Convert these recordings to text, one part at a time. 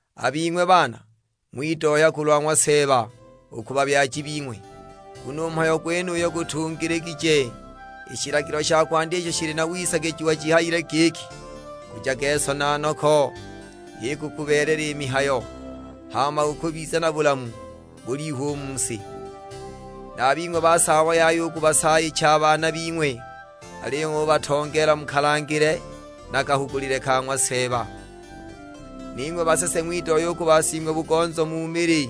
A bing'we baana ng'widohya kulwa ng'wa Seeba u ku babyaji bing'we, nguno u mhayo gwenuyu gutungiligije. I shilagilo sha kwandya isho shili na wisagijiwa shihayile giki, "Nkujage so na noko, h'ikukubeelela i mihayo; hama ukubiza na bulamu bulihu u mu si." Na a bing'we basaabo yaya u kubasaayicha a baana bing'we, aliyo ng'ubatongeela mu kalangile na kahugulile ka ng'wa Seeba. Ning'we basese ng'widohya u ku basing'we-bugonzo mu mili;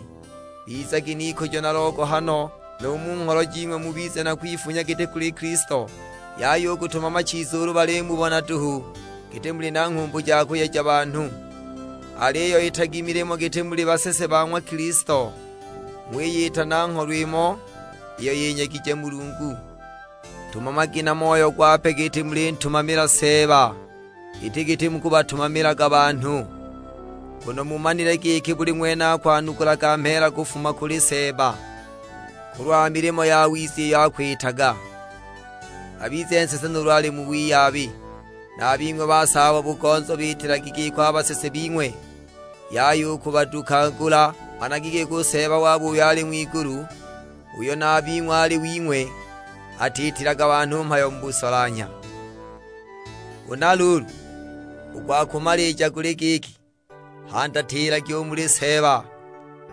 bizagi n'ikujo na logohano, nu mu ngholo jing'we mubize na kwifunya giti kuli Kilisto. Yaya u kutumama chiza ulu balimubona duhu, giti muli na nghumbu ja kuyeja banhu. Aliyo itagi i milimo giti muli basese ba ng'wa Kilisto, ng'wiyita na ngholo imo iyo yinyegije Mulungu. Tumamagi na moyo gwape giti mulintumamila Seeba, iti giti mukubatumamilaga banhu. Nguno mumanile giki buli ng'wene akwanukula mheela kufuma kuli Seeba, kulwa milimo yawiza iyo akwitaga; abize nsese nuulu ali mu wiyabi. Na a bing'we basaabo-bugonzo biitilagi giko a basese bing'we, yaya u kubadukagula. Managi giki u Seeba wabo uyo ali ng'wigulu, uyo na a bing'we ali wing'we, atiitilaga banhu mhayo mu busolanhya. Huna luulu, u gwa kumalija guli giki, handatilagi u muli Seeba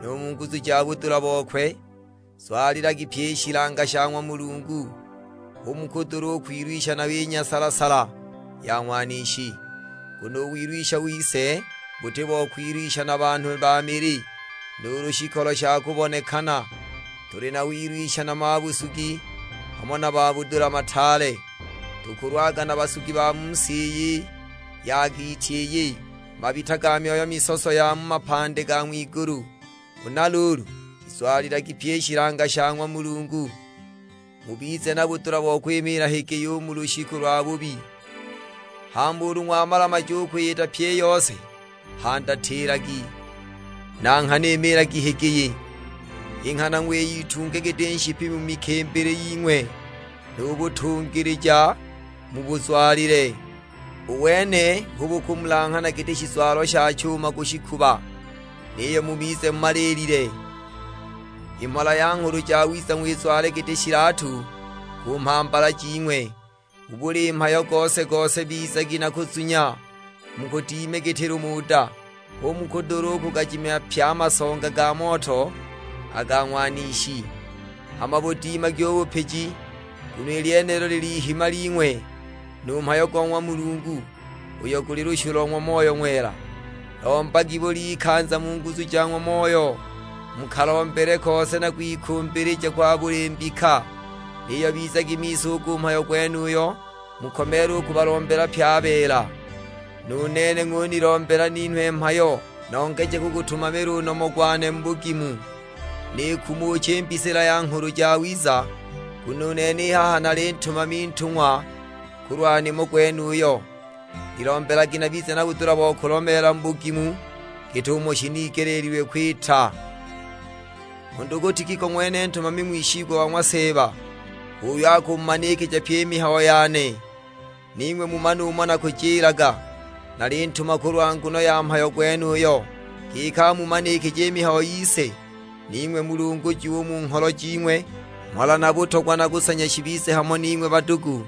nu mu nguzu ja budula bokwe. Zwalilagi pyi i shilanga sha ng'wa Mulungu, hu mukudula kwilwisha nayo i nyasala-sala ya Ng'wanishi. Nguno u wilwisha wise buti bo kwilwisha na banhu ba mili, nuulu shikolo sha kubonekana. Tuli na wilwisha na mabusugi, hamo na mabudula mataale. Tukulwaga na basugi ba mu si i ya giiti iyi, mabita ga myoyo misoso ya mu mapandi ga ng'wigulu! Huna luulu, shizwalilagi pyi i shilanga sha ng'wa Mulungu, mubize na budula bo kwimiila higiyi u mu lushiku lwabubi; hama ulu ng'wamalamaja u kwiyita pyi i yose, handatilagi. Na nghana imiilagi higiyi, i nghana ng'wiyitunge giti nshipi mu mikimbili ying'we. Nu butungilija mubuzwalile; u wene hu bukumulanghana giti shizwalo sha chuma ku shikuba. Niyo mubize mumaliilile, i mhola ya Nghulu Jawiza ng'wizwale giti shilatu ku mhambala jing'we. Mu buli mhayo gose na gose bizagi na kuzunya, mukudime giti lumuda, hu mukudula u kugajimya pye a masonga ga moto a ga Ng'wanishi! Hama budimagi u bupiji, nguno i lyenilo lil'ihima ling'we; nu mhayo go ng'wa Mulungu, uyo guli lushu lo ng'wa Moyo Ng'wela. Lombagi bul'ikanza mu nguzu ja ng'wa Moyo, mu kalombele kose na kwikumbilija kwa buli mbika. Niyo bizagi miso u ku mhayo gwenuyo, mukomeele u kubalombela pye a beela. Nu nene ng'unilombela ninhwe mhayo, nongeje kugutumamila u nomo gwane mu bugimu, nikumuche i mbisila ya Nghulu Jawiza. Nguno u nene i haha nali ntumami ntungwa kulwa nimo gwenuyo. Nilombelagi nabize na budula bo kulomeela mu bugimu git'umo shinigeleelilwe kwita. U ndugu Tikiko ng'wene ntumami ng'wishigwa wa ng'wa Seeba, h'uyo akumumanikija pyi i mihayo yane, ning'we mumane umo nakujilaga. Nalintuma kulwa nguno ya mhayo gwenuyo, giki amumanikije i mihayo yise; ning'we mulungujiwe u mu ngholo jing'we. Mhola na butogwa na kusanya shibize hamo ning'we badugu,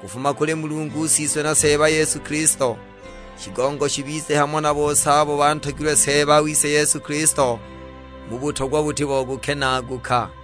kufuma kuli Mulungu Siswe na Seeba Yesu Kilisto. Shigongo shibize hamo na bose abo bantogilwe Seeba wise Yesu Kilisto, mu butogwa buti bo kukenaaguka.